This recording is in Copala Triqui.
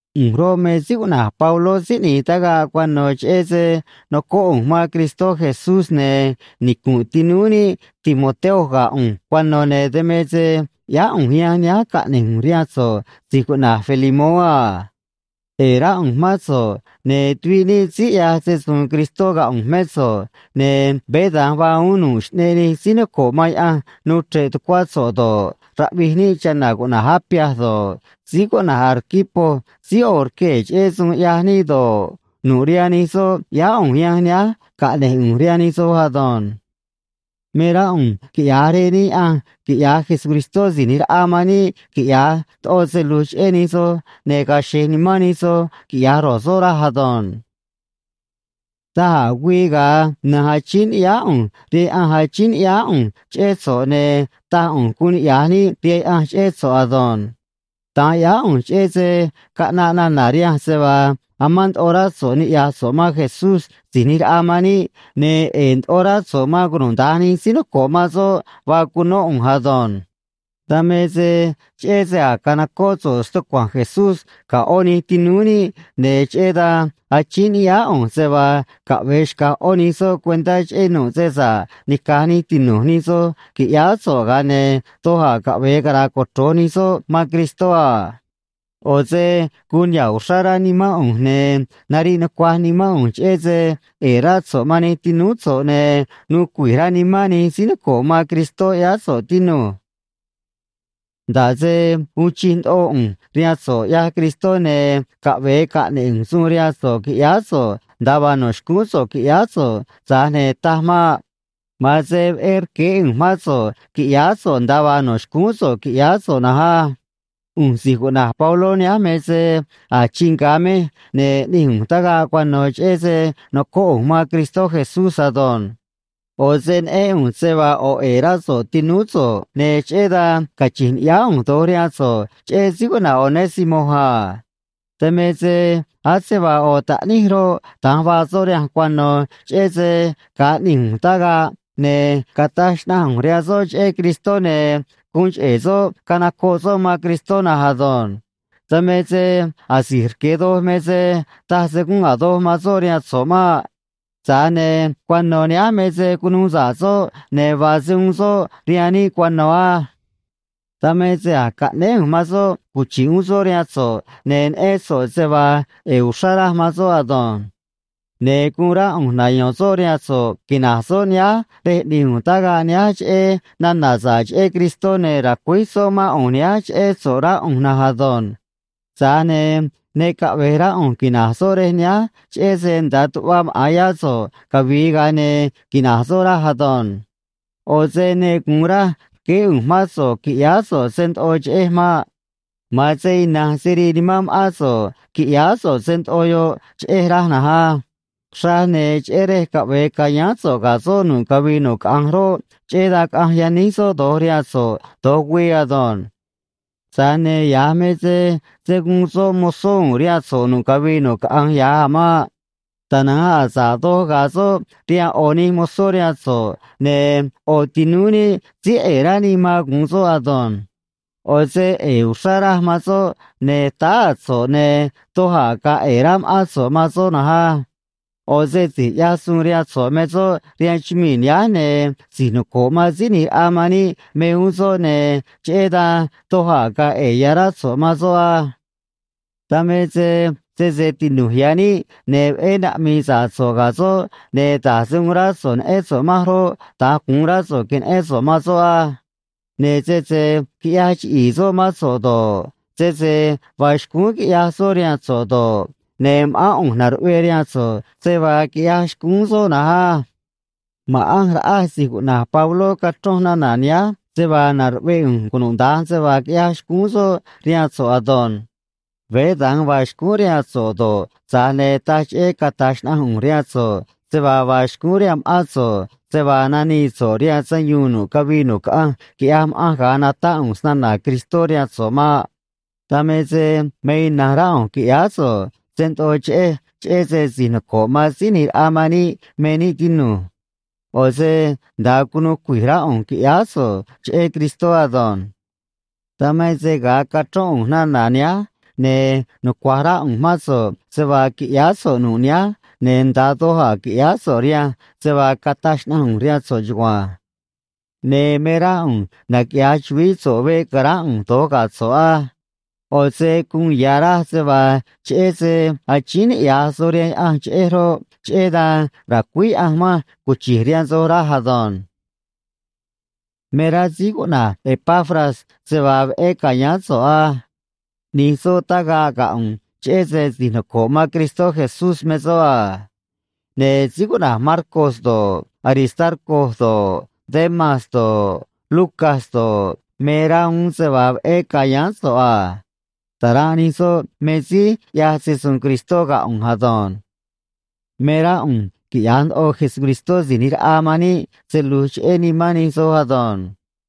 ꞌU̱nj roꞌ, me síí cuꞌna̱j Pabló síí ꞌni̱j tagaꞌ cuano̱ cheꞌé se nocóꞌ ꞌu̱nj man Cristó Jesús, ne̱ nicu̱nꞌ tinúú níꞌ Timoteo ga̱ ꞌu̱nj cuano̱, ne̱ dan me se ꞌyáá ꞌu̱nj yanj nihánj caꞌne̱j ꞌu̱nj rihaan so̱ꞌ si̱j cuꞌna̱j Filemoó a. ꞌE̱e̱ rá ꞌu̱nj mán so̱ꞌ, ne̱ tuviꞌ níꞌ síí ꞌyaj se‑su̱u̱n Cristó ga̱ ꞌu̱nj mé so̱ꞌ, ne̱ veé da̱nj vaa uún nu̱ꞌ xꞌneꞌ nij síí noco̱ꞌ man Yaꞌanj nuu chre̱ꞌ tucuá so̱ꞌ do̱ꞌ, raꞌvij níꞌ chana̱ cuꞌna̱j Apia do̱ꞌ, síí cuꞌna̱j Arquipo síí ꞌo̱ rquee̱ cheꞌé suun ꞌyaj níꞌ do̱ꞌ, nu̱ꞌ rihaan nij soꞌ ꞌyáá ꞌu̱nj yanj nihánj caꞌne̱j ꞌu̱nj rihaan nij soj ado̱nj. Me rá ꞌu̱nj quiꞌya̱j Rej níꞌ Yaꞌanj quiꞌya̱j Jesucristó Si̱j ꞌNi̱j Raꞌa man níꞌ quiꞌya̱j ndoꞌo se lu̱j cheꞌé nij soj, ne̱ ga̱a̱ xe̱j nimán nij soj, quiꞌya̱j ro̱j soꞌ, raj ado̱nj. Daj a̱ güii ga̱a na̱nj achíín ni̱ꞌyáá ꞌu̱nj rihaan Yaꞌanj, achíín ni̱ꞌyáá ꞌu̱nj cheꞌé so̱ꞌ, ne̱ taj ꞌu̱nj guun niꞌya̱j níꞌ rihaan Yaꞌanj cheꞌé so̱ꞌ ado̱nj. Da̱nj ꞌyáá ꞌu̱nj, cheꞌé se caꞌnaꞌ nana̱ rihanj se vaa amán ndoꞌo rá so̱ꞌ niꞌya̱j so̱ꞌ man Jesús Si̱j ꞌNi̱j Raꞌa man níꞌ, ne̱ ꞌe̱e̱ ndoꞌo rá so̱ꞌ man cunuda̱nj nij síí noco̱ꞌ man soꞌ vaa cunó ꞌu̱nj ado̱nj. Dan me se cheꞌé se a̱j canocóꞌ so̱ꞌ stucua̱nj Jesús ga̱ ꞌó nij tinúú níꞌ, ne̱ cheꞌé dan achíín ni̱ꞌyáá ꞌu̱nj se vaa caꞌve̱e xca̱j ꞌó nij soꞌ cuentá cheꞌé nu̱ꞌ se sa̱ꞌ nica̱j nij tinu̱j nij soj qui̱ꞌyáá so̱ꞌ, ga̱a ne̱ doj a̱ caꞌve̱e cara̱a̱ cochro̱j nij soꞌ man Cristó a. ꞌO̱ se guun niha̱ꞌ uxrá rá nimán ꞌu̱nj, ne̱ nariꞌ nucuaj nimán ꞌu̱nj, cheꞌé se ꞌe̱e̱ rá so̱ꞌ man nij tinúú so̱ꞌ ne̱ nuu cui̱j rá nimán nij síí noco̱ꞌ man Cristó ꞌyáá so̱ꞌ, tinu̱j. Nda̱ꞌ se uun chij ndoꞌo ꞌu̱nj rihaan so̱ꞌ ꞌyaj Cristó ne̱ caꞌve̱e caꞌne̱ꞌ ꞌu̱nj suun rihaan so̱ꞌ qui̱ꞌyáá so̱ꞌ nda̱a vaa no̱ xcúún so̱ꞌ qui̱ꞌyáá so̱ꞌ, tza̱j ne̱ taj maꞌ. Ma̱an se veꞌé rqueé ꞌu̱nj mán so̱ꞌ qui̱ꞌyáá so̱ꞌ nda̱a vaa no̱ xcúún so̱ꞌ qui̱ꞌyáá so̱ꞌ na̱nj á. ꞌU̱nj si̱j cuꞌna̱j Pabló nihánj me se a̱j chii nga̱ mej ne̱ ꞌni̱j ꞌu̱nj tagaꞌ cuano̱ cheꞌé se nocóꞌ ꞌu̱nj man Cristó Jesús ado̱nj. ꞌO̱ se neꞌén ꞌu̱nj se vaa ꞌo̱ ꞌe̱e̱ rá so̱ꞌ tinúú so̱ꞌ, ne̱ cheꞌé dan cachi̱nj ni̱ꞌyáá ꞌu̱nj do̱j rihaan so̱ꞌ cheꞌé síí cuꞌna̱j Onésimo a. Dan me se ase vaa ꞌo̱ taꞌníj roꞌ, da̱nj vaa soꞌ rihanj cuano̱, cheꞌé se ga̱a ꞌni̱j ꞌu̱nj tagaꞌ, ne̱ cataj xnaꞌanj ꞌu̱nj rihaan soꞌ cheꞌé Cristó, ne̱ guun cheꞌe̱ soꞌ canocoꞌ soꞌ man Cristó na̱nj ado̱nj. Dan me se asi̱j rque̱ doj me se taj se gúnꞌ a̱ doj man soꞌ rihaan so̱ꞌ maꞌ. Tza̱j ne̱ cuano̱ nihánj me se cunuu sa̱ꞌ soꞌ, ne̱ vaa se uun soꞌ rihaan níꞌ cuano̱ á. Dan me se a̱j caꞌnéé ꞌu̱nj man soꞌ cuchi̱ꞌ uún soꞌ rihaan so̱ꞌ, ne̱ neꞌén so̱ꞌ se vaa ꞌe̱e̱ uxrá raj man soꞌ ado̱nj. Ne̱ guun rá ꞌu̱nj nayo̱n soꞌ rihaan so̱ꞌ quina̱j soꞌ nihánj rej ꞌni̱j ꞌu̱nj tagaꞌ nihánj cheꞌé nana̱ sa̱ꞌ cheꞌé Cristó, ne̱ ra̱cuíj soꞌ mán ꞌu̱nj nihánj cheꞌé so̱ꞌ, rá ꞌu̱nj na̱nj ado̱nj. Tza̱j ne̱ ne caꞌve̱j rá ꞌu̱nj quina̱j soꞌ rej nihánj, cheꞌé se nda̱a tuꞌva maꞌa̱n yá so̱ꞌ cavi̱i̱, ga̱a ne̱ quina̱j soꞌ, raj ado̱nj. ꞌO̱ se ne gu̱un raj rqueé ꞌu̱nj mán so̱ꞌ qui̱ꞌyáá so̱ꞌ se ndoꞌo cheꞌej maꞌ. Ma̱an se ina̱nj se rii nimán ma̱ꞌán so̱ꞌ qui̱ꞌyáá so̱ꞌ se ndoꞌo yoꞌ cheꞌej, raj na̱nj á. Xraj ne̱ cheꞌé rej caꞌve̱e ca̱yáán soꞌ ga̱ so̱ꞌ nu̱ꞌ cavii nu̱ꞌ caꞌanj roꞌ, cheꞌé dan caꞌanj yaníj soꞌ do̱j rihaan so̱ꞌ do̱j güii ado̱nj. Tza̱j ne̱ ya̱j me se se̱ guun soꞌ mozó u̱u̱n rihaan so̱ꞌ nu̱ꞌ cavii nu̱ꞌ caꞌanj ya̱j a̱ maꞌ. Tana̱nj a̱ sa̱ꞌ doj ga̱a̱ soꞌ rihaan ꞌo̱ nij mozó rihaan so̱ꞌ, ne̱ ꞌo̱ tinúú níꞌ síí ꞌe̱e̱ rá níꞌ man gu̱un soꞌ ado̱nj. ꞌO̱ se ꞌe̱e̱ uxrá raj man soꞌ, ne̱ táá a̱ so̱ꞌ, ne̱ doj a̱ ga̱a̱ ꞌe̱e̱ rá ma̱ꞌán so̱ꞌ man soꞌ na̱nj á. ꞌO̱ se si̱j ꞌyaj suun rihaan so̱ꞌ me soꞌ rihaan chumii̱ nihánj, ne̱ si̱j noco̱ꞌ man Síí ꞌNi̱j Raꞌa man níꞌ me uún soꞌ, ne̱ cheꞌé dan doj a̱ ga̱a̱ ꞌe̱e̱ ya̱ rá so̱ꞌ man soꞌ á. Dan me se sese tinu̱j ya̱ níꞌ, ne̱ veꞌé naꞌmi̱i̱ sa̱ꞌ so̱ꞌ ga̱ soꞌ, ne̱ da̱j se uun rá so̱ꞌ neꞌén so̱ꞌ manj roꞌ, da̱nj gu̱un rá so̱ꞌ que̱neꞌén so̱ꞌ man soꞌ á. Ne̱ sese quiꞌyaj chiꞌi̱i̱ soꞌ mán so̱ꞌ do̱ꞌ, sese vaa xcúún quiꞌyaj soꞌ rihaan so̱ꞌ do̱ꞌ, ne̱ ma̱ꞌán ꞌu̱nj na̱ruꞌvee rihaan so̱ꞌ se vaa quiꞌyaj xcúún soꞌ na̱nj á. Ma̱ꞌanj raꞌaj si̱j cuꞌna̱j Pabló cachronj nana̱ nihánj se vaa na̱ruꞌvee ꞌu̱nj cunuda̱nj se vaa quiꞌyaj xcúún soꞌ rihaan so̱ꞌ ado̱nj. Veé da̱nj vaa xcúún rihaan soꞌ do̱ꞌ, tza̱j ne̱ taj cheꞌé cata̱j xnaꞌanj ꞌu̱nj rihaan so̱ꞌ se vaa vaa xcúún rihaan ma̱ꞌán so̱ꞌ se vaa nanii so̱ꞌ rihaan sayuun nu̱ꞌ cavii nu̱ꞌ caꞌanj, quiꞌyaj ma̱ꞌanj ga̱a natáꞌ ꞌu̱nj snana̱ Cristó rihaan so̱ꞌ maꞌ. Dan me se me ina̱nj rá ꞌu̱nj qui̱ꞌyáá so̱ꞌ se ndoꞌo cheꞌej, cheꞌé se si̱j noco̱ꞌ man Síí ꞌNi̱j Raꞌa man níꞌ me níꞌ, tinu̱j. ꞌO̱ se nda̱a cunu̱u cui̱j rá ꞌu̱nj, qui̱ꞌyáá so̱ꞌ cheꞌé Cristó ado̱nj. Dan me se ga̱a cachrón ꞌu̱nj nana̱ nihánj, ne̱ nucua̱j rá ꞌu̱nj mán so̱ꞌ se vaa qui̱ꞌyáá so̱ꞌ nu̱ꞌ nihánj, ne̱ nda̱a doj a̱ qui̱ꞌyáá so̱ꞌ rihaan se vaa cataj xnaꞌanj ꞌu̱nj rihaan so̱ꞌ chugua̱nj. Ne̱ me rá ꞌu̱nj naquiꞌya̱j chu̱vií so̱ꞌ veꞌ ca̱ránꞌ ꞌu̱nj do̱j ga̱ so̱ꞌ á. ꞌO̱ se guun ya̱ raj se vaa cheꞌé se achíín niꞌya̱j soj rihaan Yaꞌanj cheꞌej roꞌ, cheꞌé dan ra̱cuíj Yaꞌanj manj cuchi̱j rihaan soj, raj ado̱nj. Me rá síí cuꞌna̱j Epafras se vaa veꞌé ca̱yáán so̱ꞌ á. ꞌNi̱j soꞌ tagaꞌ ga̱ ꞌu̱nj, cheꞌé se si̱j noco̱ꞌ man Cristó Jesús me soꞌ a. Ne̱ síí cuꞌna̱j Marcos do̱ꞌ, Aristarco do̱ꞌ, Demas do̱ꞌ, Lucas do̱ꞌ, me rá uún se vaa veꞌé ca̱yáán so̱ꞌ a. Ta̱ranꞌ nij soꞌ me síí ꞌyaj se‑su̱u̱n Cristó ga̱ ꞌu̱nj ado̱nj. Me rá ꞌu̱nj quiꞌya̱j ndoꞌo Jesucristó Si̱j ꞌNi̱j Raꞌa man níꞌ se lu̱j cheꞌé nimán nij soj ado̱nj.